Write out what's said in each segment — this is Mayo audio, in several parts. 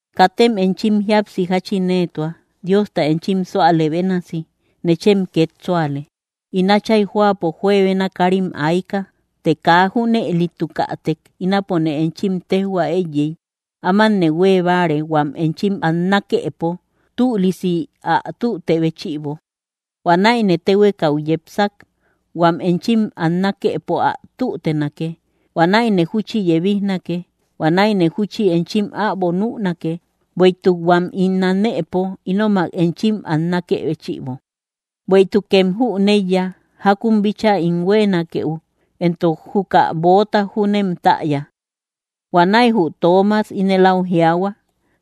’Katem enchim jíapsi jáchin éetua. Diosta enchim súalë bénasi, nechem két súale. In Átchay jóapo juebena káarim ayka; të kaa junëlitukätek ínapone enchim téjhua éiyey. Ámanne huée báare, huam enchim annakëpo tülisi ä tüte béchïbo. Huanäine téhuekau yepsak, huam enchim annakëpo ä tútenake. Huanäine júchi yebijnake. Huanäine júchi enchim äbo nünake, bueïtuk huam ín anëpo, ínomak enchim annakë béchïbo. Bueïtukem jüneiya jákun bíchaa ín huéenakeu, éntok juka böota júnem täya. Huanäi jü Toomas ínel áu jiaahua: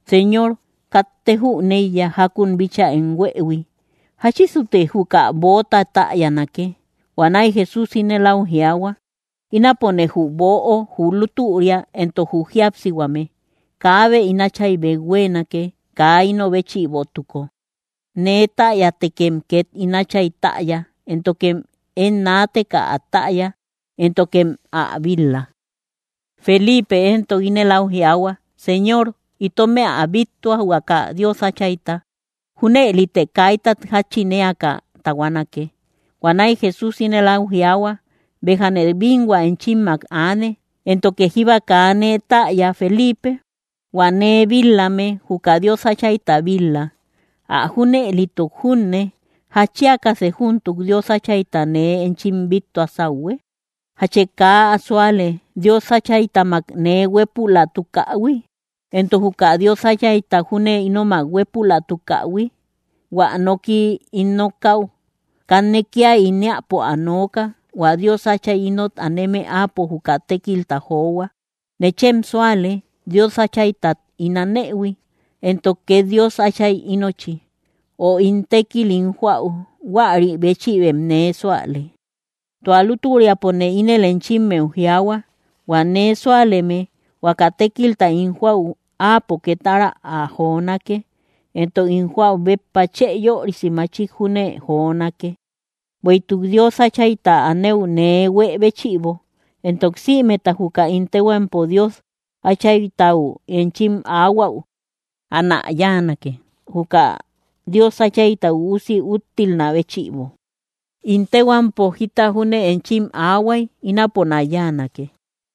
—Señor, katte jüneiya jákun bíchaa em huëhui; ¿jáchisute juka böota täyanake? Huanäi Jesús ínel áu jiaahua: —Ínapone jü böo, jü lútüria, éntok jü jíapsihuame; kaabe ín Áchaybeu huéenake, kaa ino béchïbotuko. Nee täyätekem két ín Átchay täya; éntokem én naateka ä täya, éntokem ä bil-la. Feliipe éntok ínel áu jiaahua: —Señor, itomë ä bíttua, huaka Dios Áchayta. Júnëlite kaitat jáchin éaka tahuanake. Huanäi Jesús ínel áu jiaahua: —Béjane bínhua enchimmak aane, ¿éntoke jíba kaa nee täya, Feliipe? Huä nee bil-lame, juka Dios Áchayta bil-la. Ä junëlituk junne, ¿jatchiakasë júntuk Dios Áchayta nee enchim bíttua sáuhue? ¿Jachë kaa ä súale, Dios Áchaytamak nee huépülatukähui?, éntok, ¿juka Dios Áchayta júne ínomak huépülatukähui? Huä noki ín nokäu, kanne kía ín éäpo ä nooka; hua Dios Átchay ínot aneme, áapo juka tékilta johua. Nechem súale, Dios Áchaytat ín anëhui, éntok két Dios Áchay ínochi; o hua tékil ín joäu, huäri béchïbem nee súale. Tua lútüriapone ínel enchimmeu jiaahua: Huä nee súaleme, huaka tékilta ín joäu áapo két ára ä jonake, éntok ín joäu béppa chë yörisi machik júne jonake, bueïtuk Dios Áchayta anëu nee huë béchïbo. Éntok sïmeta juka ín téhuampo Dios Áchaytau enchim aahuäu, anä yáanake, juka Dios Áchayta Üusi úttilnä béchïbo. In téhuampo jita júne enchim aahuay, ínaponä yáanake.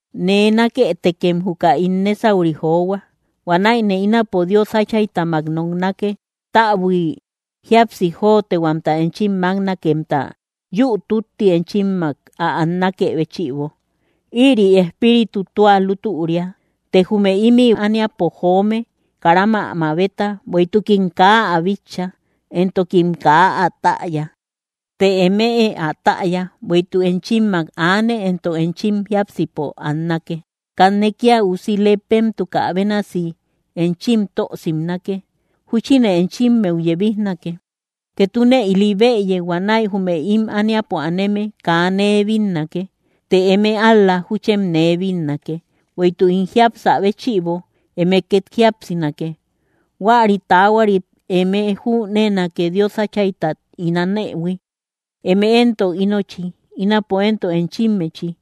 ’Nee nákëtekem juka ín nésauri johua. Huanäine ínapo Dios Áchaytamak noknake, täbui jíapsi jotehuamta enchim máknakemta, yü tütti enchimmak ä annakë béchïbo. Ïri Espíritu tua lútüria. Të jume ímï ániapo joome, karam ä mabeta, bueïtukim kaa ä bitcha, éntokim kaa ä täya; të eme ä täya, bueïtuk enchimmak aane, éntok enchim jiápsipo annake. Kanne kía usi lepemtukä bénasi enchim tö simnake. Júchine enchimmeu yebijnake. Ketune ili bëye; huanäi jume ím ániapo aneme kaa nee bínnake; të eme ál‑la júchem nee bínnake; bueïtuk ín jiapsä béchïbo, eme két jíapsinake. Huäri taahuarit eme jüneenake Dios Áchaytat ín anëhui; eme éntok ínochi, ínapo éntok enchimmechi.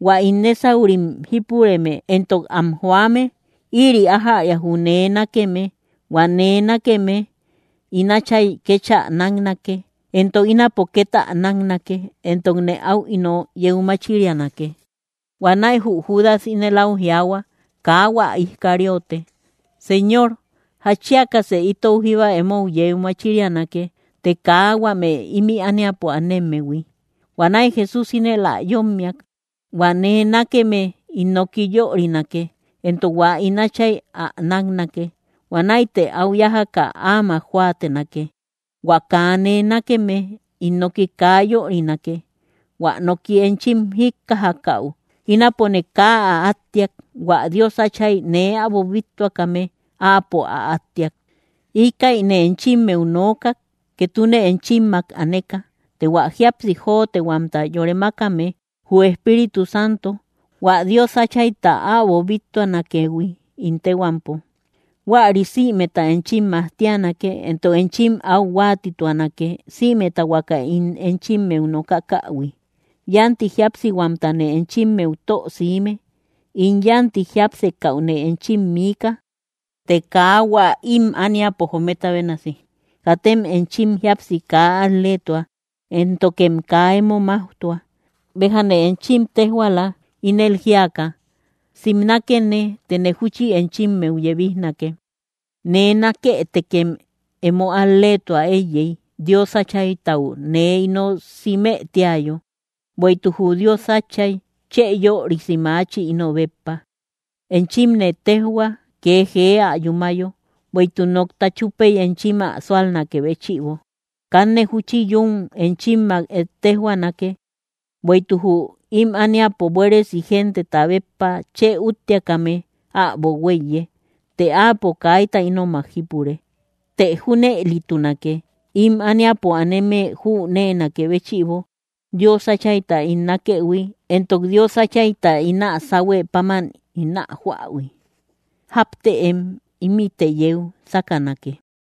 Huä ín nésaurim jípureme éntok am joame, ïri ájäria jü nee nákeme; hua nee nákeme, ín Áchay kéchä náknake. Éntok ínapo két ä náknake, éntokne áu ino yeu machirianake. Huanäi jü Judas ínel áu jiaahua, kaa hua Iscariote: —Señor, ¿jatchiakasë itou jíba emo yeu machirianake, të kaa huame ímï ániapo anemmehui? Huanäi Jesús ínel ä yómmiak: —Huä nee nákeme ín noki yörinake; éntok hua ín Áchay ä náknake. Huanäite áu yájaka áamak jóatenake. Huä kaa nee nákeme ín noki kaa yörinake; hua noki enchim jíkkajakäu, ínapone kaa ä átteak. Huä Dios Átchay nee äbo bíttuakame, Áapo ä átteak. ’Íkäine enchimmeu nookak ketune enchimmak aneka. Të hua jíapsi jotehuamta yore mákame, jü Espíritu Santo, hua Dios Áchayta äbo bíttuanakëhui ín téhuampo, huäri sïmeta enchim majtianake, éntok enchim áu huáatituanake, sïmeta huaka ín enchimmeu nokakähui. ’Yánti jíapsihuamtane enchimmeu tö siime. In yánti jiápsekäune enchim miika, të kaa hua ím ániapo jometa bénasi. Katem enchim jíapsi kaa al‑leetua, éntokem kaa emo máujtua. Béjane enchim téjhuaala, ínel jíaka: Simnakene, tëne júchi enchimmeu yebijnake. Nee nákëtekem emo al‑leetuä éiyey, Dios Áchaytau nee ino simë tíayo; bueïtuk jü Dios Áchay chë yörisi maachi, ino béppa. Enchimne téjhuak, kee jee ä yúmayo, bueïtuk nokta chúpey enchim ä súalnakë béchïbo. ’Kanne júchi yún enchimmak ettejhuanake, bueïtuk jü ím ániapo buéresi genteta béppa chë úttiakame äbo huéiye; të áapo kaita ínomak jípure. Të junëlitunake, ím ániapo aneme jüneenakë béchïbo Dios Áchayta ín nákëhui éntok Dios Áchayta ín ä sáhuë páman ín ä joähui. Jáptëem; ímïte yeu sákanake.